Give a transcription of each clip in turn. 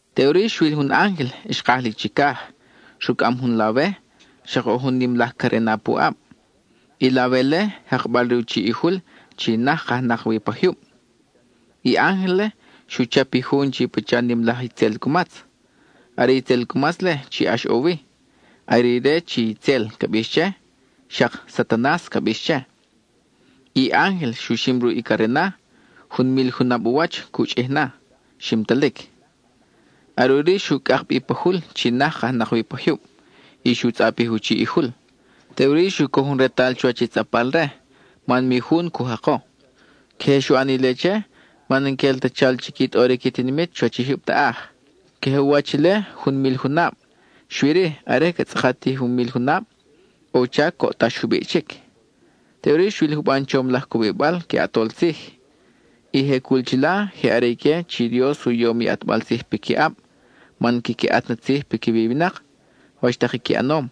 Teʼuri xwil jun ángel xkaj li chicaj, rucʼam jun lawe, xak ʼo jun nim laj carena pu ʼab. I lawe-le, jakbal re u chiʼ i jul chi naj kajnak wi pa jyub. I ángel-le xu chap i jun chi pacha nim laj itzel cumatz; are i itzel cumatz-le chi ʼax ʼo wi; are ire chi “itzel” ca bix che, xak “Satanas” ca bix che. I ángel xu xim ruʼ i carena; jun mil junab u wach cu chʼij na, ximtalic. Are ʼuri xu cʼak bi pa jul chi naj kajnak wi pa jyub, y xu tzʼapij u chiʼ i jul; teʼuri xu coj jun retal chuwach i tzʼapbal-re, man mi jun cu jako. Queje xu ʼan ile che, man n-quel ta chal chi qui tʼoric i tinimit chuwach i jyub taʼaj. Queje u wach ile jun mil junab, xui-ri, are ca tzʼakat i jun mil junab, ʼo u chac coʼtax jubiʼ chic. Teʼuri xwil juban chom laj cubibal que ʼatol tzij. I je cul chila je are ique chi Dios u yom i ʼatbal tzij piquiʼab man quiqui ʼat na tzij piquiwi i winak, wach tak i qui ʼanom.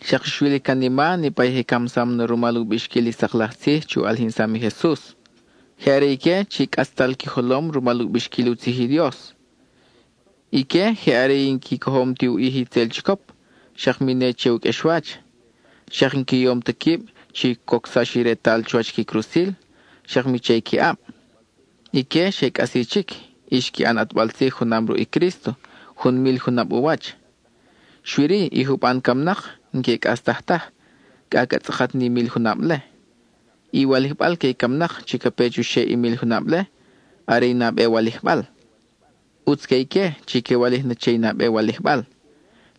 Xak xwil i canima niʼpa i je camsam na rumal u bixquil i sak laj tzij chi u ʼalijinsam i Jesus. Je are ique chi cʼatztal qui jolom rumal u bixquil u tzij i Dios. Ique je are i n-qui cojom ti u ʼij i itzel chicop, xak mi ne che u qʼuexwach. Xak n-qui yom ta quib chi cocsax u retal chuwach qui crusil, xak mi che qui ʼab. Ique xe cʼasi chic, y xqui ʼan ʼatbal tzij junam ruʼ i Crísto, jun mil junab u wach. Xui-ri, i juban camnak n-que cʼastaj taj, cʼa ca tzʼakat ni mil junab-le. I walijbal que i camnak chi ca pe chuxeʼ i mil junab-le, are i nabe walijbal. ¡ʼUtz que ique chi que walij na che i nabe walijbal!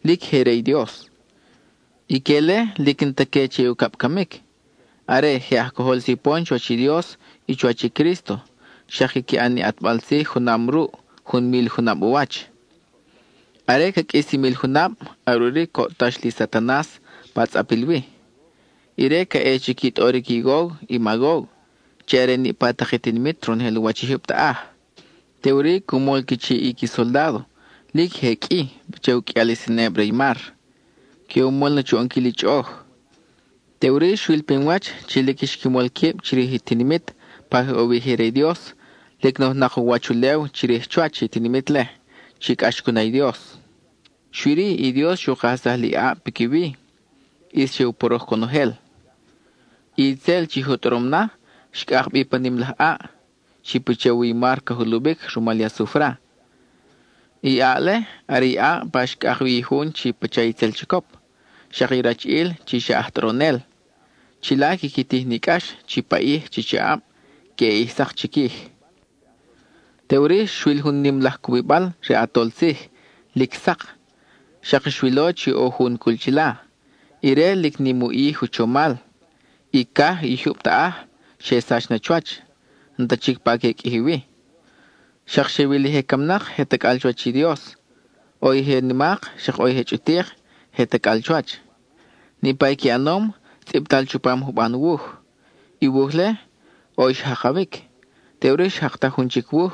¡Lic je re i Dios! Ique-le lic n-ta que che i ucab camic; are, je aj cojol sipon chuwach i Dios y chuwach i Crísto, xak quiqui ʼan ni ʼatbal tzij junam ruʼ, jun mil junab u wach. Are ca qʼuis i mil junab, are ʼuri coʼtax li Satanas pa tzʼapil wi. Ire ca ʼe chi qui tʼoric i Gog y Magog, chi are niʼpa tak i tinimit ronojel u wach i jyub taʼaj. Teʼuri cu mol qui chiʼ i qui soldádo, lic je qʼui, pacha i u qʼuial i seneb re i mar. Que u mol na chu ʼonquil i chʼoʼoj. Teʼuri, xwil pinwach chi lic xqui mol quib chirij i tinimit pa je ʼo wi i je re i Dios, lic nojnak u wach ulew chirij chuwach i tinimit-le chi cʼax cu na i Dios. Xui-ri i Dios xu kajsaj li ʼaʼ piquiwi; ʼis xe u poroj conojel. I itzel, chi je u tʼorom na, xcʼak bi pa nim laj ʼaʼ, chi pacha u wi i mar ca juluwic rumal i asufra. I ʼaʼ-le are i ʼaʼ pa xcʼak wi i jun chi pacha itzel chicop, xak i rachiʼil chi xa aj tʼoronel. Chila quiqui tij ni cʼax chi paʼij chi chaʼab queʼe ʼij sak chiquij. Teʼuri xwil jun nim laj cubibal re ʼatol tzij, lic sak; xak xwilo chi ʼo jun cul chila. Ire, lic nim i u ʼij u chomal; i caj i jyub taʼaj xe sach na chuwach, n-ta chic pa que qʼuiji wi. Xak xe wil i je camnak je tacʼal chuwach i Dios; ʼo i je nimak, xak ʼo i je chʼutik, je tacʼal chuwach. Niʼpa i qui ʼanom, tzʼibtal chupam juban wuj. I wuj-le, ʼo i xjakawic; teʼuri xjaktaj jun chic wuj,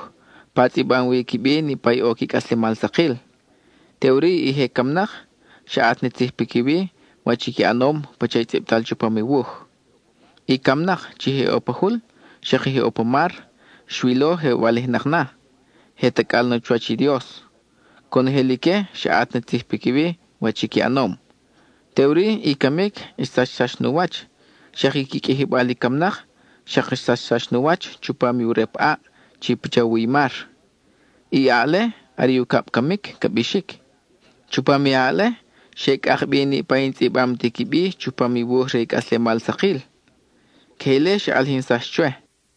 pa tzʼibam wi qui bi niʼpa i ʼo qui cʼaslemal sakil. Teʼuri i je camnak, xa ʼat ni tzij piquiwi, wach i qui ʼanom, pacha i tzʼibtal chupam i wuj. I camnak chi je ʼo pa jul, xak i je ʼo pa mar, xwilo je walijnak na, je tacʼal na chuwach i Dios. Conojel ique xa ʼat na tzij piquiwi, wach i qui ʼanom. Teʼuri, i camic xsachsax nu wach, xak i qui qʼuijibal i camnak xak xsachsax nu wach chupam u rep ʼaʼ chi pacha u wi i mar. I ʼaʼ-le, are i ucab camic ca bixic. Chupam i ʼaʼ-le, xe cʼak bi niʼpa i n-tzʼibam ti qui bi chupam i wuj re i cʼaslemal sakil. (Queje ile xa ʼalijinsax chwe.)